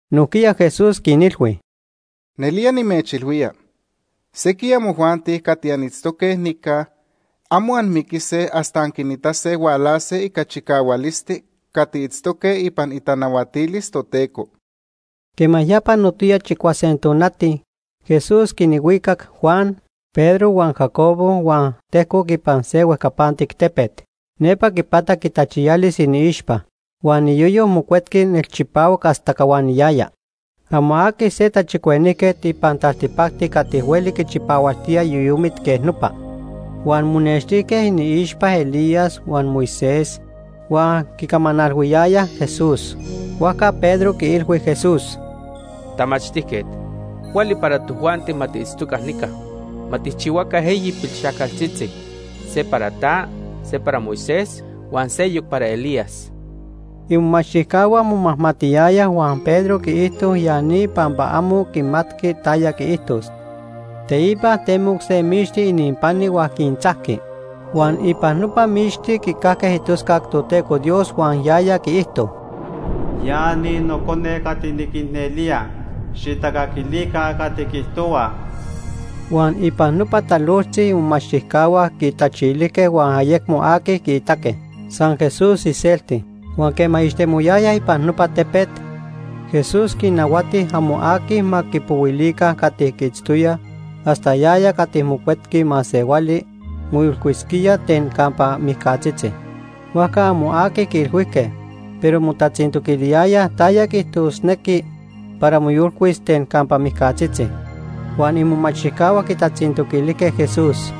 Nojquiya Jesús quinilhui: ―Nelía nimechilhuía, sequij amojuanti cati anitztoque nica amo anmiquise hasta anquinitase hualase ica chicahualisti cati itztoque ipan itanahuatilis Toteco. Quema ya panotoya chicuase tonati, Jesús quinhuicac Juan, Pedro huan Jacobo huan tejcoc ipan se huejcapantic tepet. Nepa quipatac itachiyalis iniixpa. Huan iyoyo mocuetqui nelchipahuac hasta cahuaniyaya. Amo aqui se tachicuenijquet ipan taltipacti cati hueli quichipahualtía yoyomit quej nopa. Huan monextijque iniixpa Elías huan Moisés huan quicamanalhuiyayaj Jesús. Huajca Pedro quiilhui Jesús: ―Tamachtijquet, cuali para tojuanti ma tiitztoca nica. Ma tijchihuaca eyi pilxajcaltzitzi: se para ta, se para Moisés, huan seyoc para Elías. Imomachtijcahua momajmatiyayaj huan Pedro quiijto ya ni pampa amo quimatqui taya quiijtos. Teipa temoc se mixti ininpani huan quintzajqui, huan ipan nopa mixti quicajque itoscac Toteco Dios huan yaya quiijto: “Ya ni Nocone cati niquicnelía, xijtacaquilica cati quiijtohua.” Huan ipan nopa talojtzi imomachtijcahua quitachilijque huan ayecmo aqui quiitaque, san Jesús iselti. Huan quema ixtemoyayaj ipan nopa tepet, Jesús quinnahuati amo aqui ma quipohuilica cati quiitztoyaj hasta yaya cati Mocuetqui Masehuali moyolcuisquía ten campa mijcatzitzi. Huajca amo aqui quiilhuijque, pero motatzintoquiliyayaj taya quiijtosnequi para moyolcuis ten campa mijcatzitzi. Huan imomachtijcahua quitatzintoquilijque Jesús: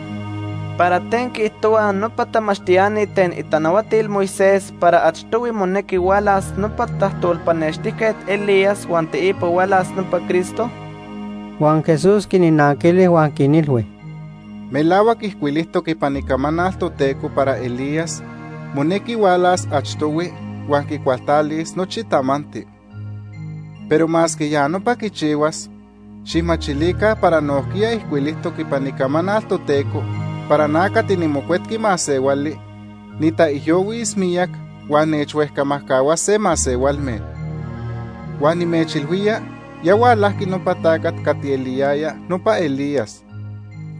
―¿Para ten quiijtohuaj nopa tamachtiani ten itanahuatil Moisés para achtohui monequi hualas nopa tajtolpanextijquet Elías huan teipa hualas nopa Cristo? Huan Jesús quinnanquili huan quinilhui: ―Melahuac ijcuilijtoc ipan Icamanal Toteco para Elías monequi hualas achtohui huan quicualtalis nochi tamanti. Pero masque ya nopa quichihuas, xijmachilica para nojquiya ijcuilijtoc ipan Icamanal Toteco para na cati niMocuetqui Masehuali nitaijyohuis miyac huan nechhuejcamajcahuase masehualme. Huan nimechilhuía ya hualajqui nopa tacat cati eliyaya nopa Elías,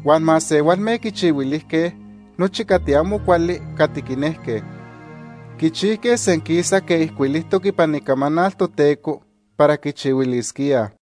huan masehualme quichihuilijque nochi cati amo cuali cati quinejque. Quichijque senquisa quej ijcuilijtoc ipan Icamanal Toteco para quichihuilisquíaj.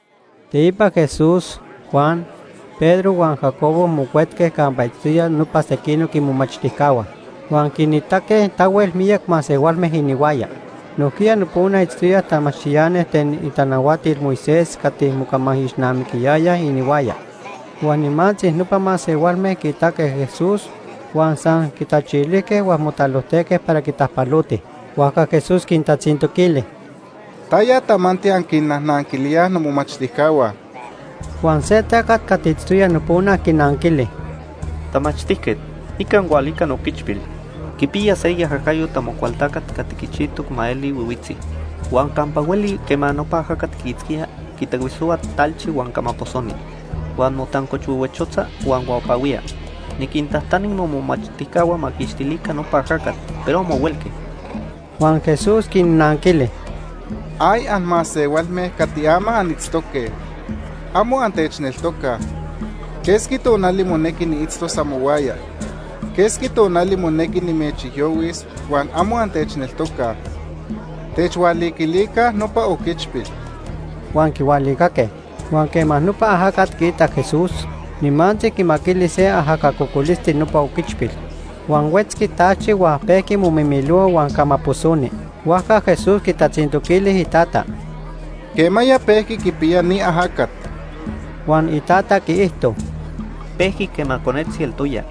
Teipa Jesús, Juan, Pedro huan Jacobo mocuetque campa itztoyaj nopa sequinoc imomachtijcahua. Huan quinitaque tahuel miyac masehualme inihuaya. Nojquiya nopona itztoyaj tamachtiani ten itanahuatil Moisés cati mocamaijixnamiquiyayaj inihuaya. Huan nimantzi nopa masehualme quiitaque Jesús huan san quitachilijque huan motalojtejque para quitajpalotij. Huajca Jesús quintatzintoquili: ―¿Taya tamanti anquinnajnanquilíaj nomomachtijcahua? Huan se tacat cati itztoya nopona quinanquili: ―Tamachtijquet, nica nijhualica nooquichpil. Quipiya se iajacayo Amocualtacat cati quichijtoc ma eli nonotzi. Huan campa hueli quema nopa ajacat quiitzquía, quitahuisohua talchi huan camaposoni. Huan motancochhuehuechotza huan huapahuía. Niquintajtani momomachtijcahua ma quiquixtilica nopa ajacat, pero amo huelque. Huan Jesús quinnanquili: ―¡Ay, anmasehualme cati ama anitztoque! ¡Amo antechneltocaj! ¿Quesqui tonali monequi niitztos amohuaya? ¿Quesqui tonali monequi nimechijyohuis huan amo antechneltocaj? ¡Techhualiquilica nopa oquichpil! Huan quihualicaque. Huan quema nopa ajacat quiitac Jesús, nimantzi quimaquili se ajaca cocolisti nopa oquichpil. Huan huetzqui talchi huan pejqui momimilohua huan camaposoni. Huajca Jesús quitatzintoquili itata: ―¿Quemaya pejqui quipiya ni ajacat? Huan itata quiijto: ―Pejqui quema conetzi eltoya.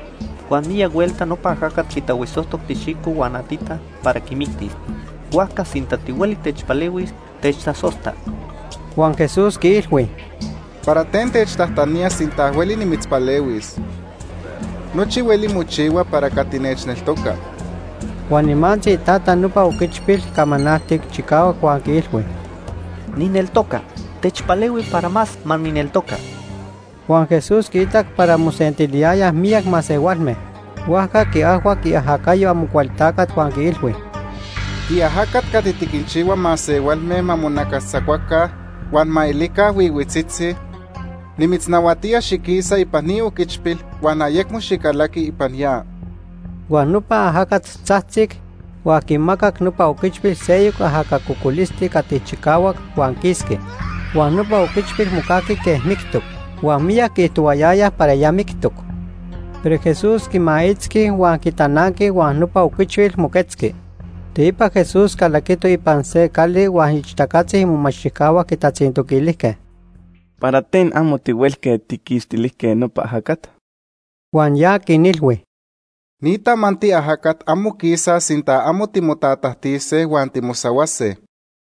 Huan miyac huelta nopa ajacat quitahuisojtoc tixijco huan atita para quimictis. Huajca sinta tihueli techpalehuis, techtasojta. Huan Jesús quiilhui: ―¿Para ten techtajtanía sinta hueli nimitzpalehuis? Nochi hueli mochihua para cati nechneltoca. Huan nimantzi itata nopa oquichpil camanaltic chicahuac huan quiilhui: ―¡Nijneltoca! ¡Techpalehui para más ma nijneltoca! Huan Jesús quiitac para mosentiliyayaj miyac masehualme, huajca quiajhuac iajacayo Amocualtacat, huan quiilhui: ―Tiajacat cati tiquinchihua masehualme ma monacastzacuaca huan ma elica nonotzitzi, nimitznahuatía xiquisa ipan ni oquichpil huan ayecmo xicalaqui ipan ya. Huan nopa ajacat tzajtzic, huan quimacac nopa oquichpil seyoc ajaca cocolisti cati chicahuac, huan quisqui. Huan nopa oquichpil mocajqui quej mictoc. Huan miyac quiijtohuayayaj para ya mictoc. Pero Jesús quimaitzqui huan quitananqui huan nopa oquichpil moquetzqui. Teipa Jesús calaquito ipan se cali huan ixtacatzi imomachtijcahua quitatzintoquilijque: ―¿Para ten amo tihuelque tijquixtilijque nopa ajacat? Huan ya quinilhui: ―Ni tamanti ajacat amo quisaj sinta amo timotatajtise huan timosahuase.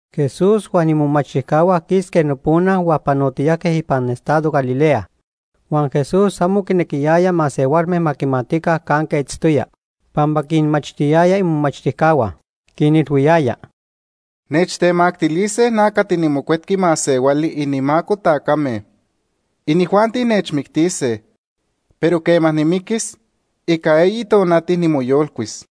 Jesús huan imomachtijcahua quisque nopona huan panotiyajque ipan estado Galilea. Huan Jesús amo quinequiyaya masehualme ma quimatica canque itztoya, pampa quinmachtiyaya imomachtijcahua. Quinilhuiyaya: ―Nechtemactilise na cati niMocuetqui Masehuali inimaco tacame. Inijuanti nechmictise, pero quema nimiquis, ica eyi tonati nimoyolcuis.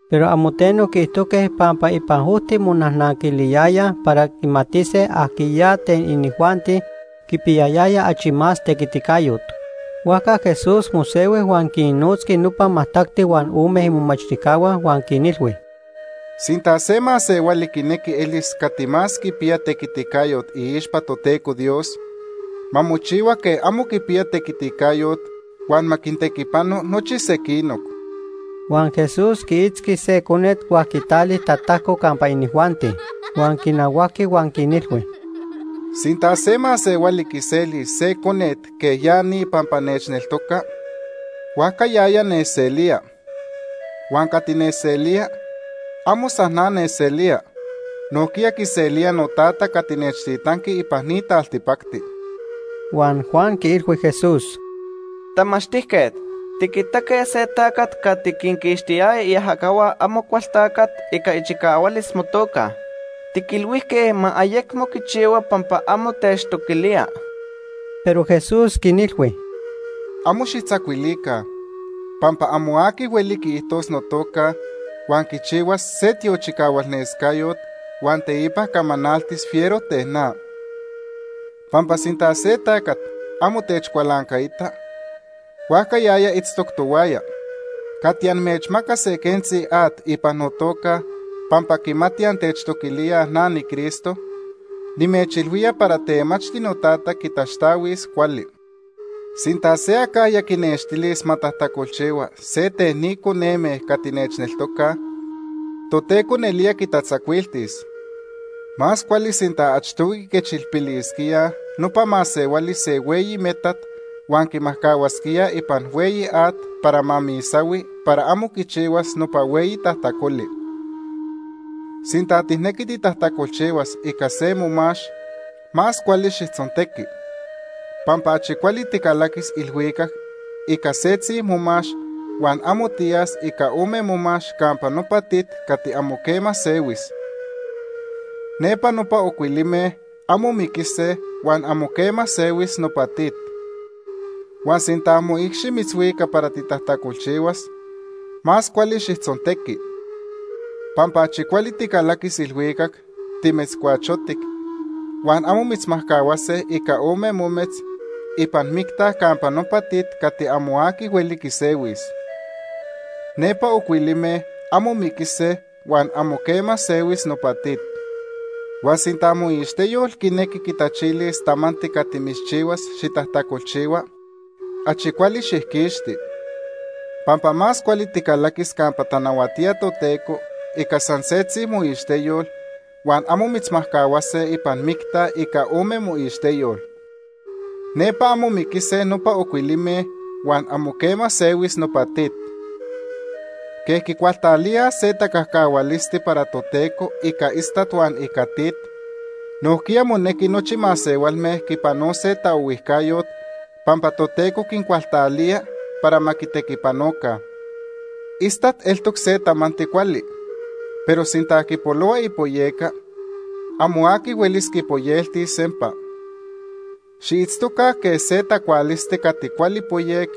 Pero amo teno quiijtojque pampa ipan ojti monajnanquiliyayaj para quimatise ajquiya ten inijuanti quipiyayaya achi más tequiticayot. Huajca Jesús mosehui huan quinnotzqui nopa majtacti huan ome imomachtijcahua, huan quinilhui: ―Sinta se masehuali quinequi elis cati más quipiya tequiticayot iixpa Toteco Dios, ma mochihua quej amo quipiya tequiticayot huan ma quintequipano nochi sequinoc. Huan Jesús quiitzqui se conet huan quitali tatajco campa inijuanti. Huan quinahuajqui huan quinilhui: ―Sinta se masehuali quiselis se conet quej ya ni pampa nechneltoca, huajca yaya nechselía. Huan cati nechselía, amo san na nechselía, nojquiya quiselía noTata cati nechtitanqui ipan ni taltipacti. Huan Juan quiilhui Jesús: ―Tamachtijquet, tiquitaque se tacat cati quinquixtiyaya iajacahua Amocualtacat ica ichicahualis motoca. Tiquilhuijque ma ayecmo quichihua pampa amo techtoquilía. Pero Jesús quinilhui: ―Amo xijtzacuilica, pampa amo aqui hueli quiijtos notoca, huan quichihuas se tiochicahualnescayot huan teipa camanaltis fiero ten na. Pampa sinta se tacat amo techcualancaita, huajca yaya itztoc tohuaya. Cati amechmacas se quentzi at ipan notoca pampa quimati antechtoquilíaj na niCristo, nimechilhuía para temachti noTata quitaxtahuis cuali. “Sinta se acajya quinextilis ma tajtacolchihua se ten ni coneme cati nechneltocaj, Toteco nelía quitatzacuiltis. Más cuali sinta achtohui quiquechilpilisquíaj nopa masehuali se hueyi metat huan quimajcahuasquíaj ipan hueyi at para ma misahui para amo quichihuas nopa hueyi tajtacoli. Sinta tijnequi titajtacolchihuas ica se momax, más cuali xijtzontequi. Pampa achi cuali ticalaquis ilhuicac ica setzi momax, huan amo tiyas ica ome momax campa nopa tit cati amo quema sehuis. Nepa nopa ocuilime amo miquise huan amo quema sehuis nopa tit. Huan sinta moicxi mitzhuica para titajtacolchihuas, más cuali xijtzontequi. Pampa achi cuali ticalaquis ilhuicac timetzcuachotic, huan amo mitzmajcahuase ica ome mometz ipan micta campa nopa tit cati amo aqui hueli quisehuis. Nepa ocuilime amo miquise huan amo quema sehuis nopa tit. Huan sinta moixteyol quinequi quitachilis tamanti cati mitzchihuas xitajtacolchihua, achi cuali xijquixti. Pampa más cuali ticalaquis campa tanahuatía Toteco ica san setzi moixteyol huan amo mitzmajcahuase ipan micta ica ome moixteyol. Nepa amo miquise nopa ocuilime huan amo quema sehuis nopa tit. “Quej quicualtalíaj se tacajcahualisti para Toteco ica istat huan ica tit, nojquiya monequi nochi masehualme quipanose taohuijcayot pampa Toteco quincualtalía para ma quitequipanoca. Istat eltoc se tamanti cuali, pero sinta quipolohua ipoyeca, amo aqui huelis quipoyeltis sempa. Xiitztoca quej se tacualisti cati cuali poyec,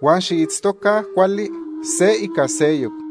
huan xiitztoca cuali se ica seyoc.”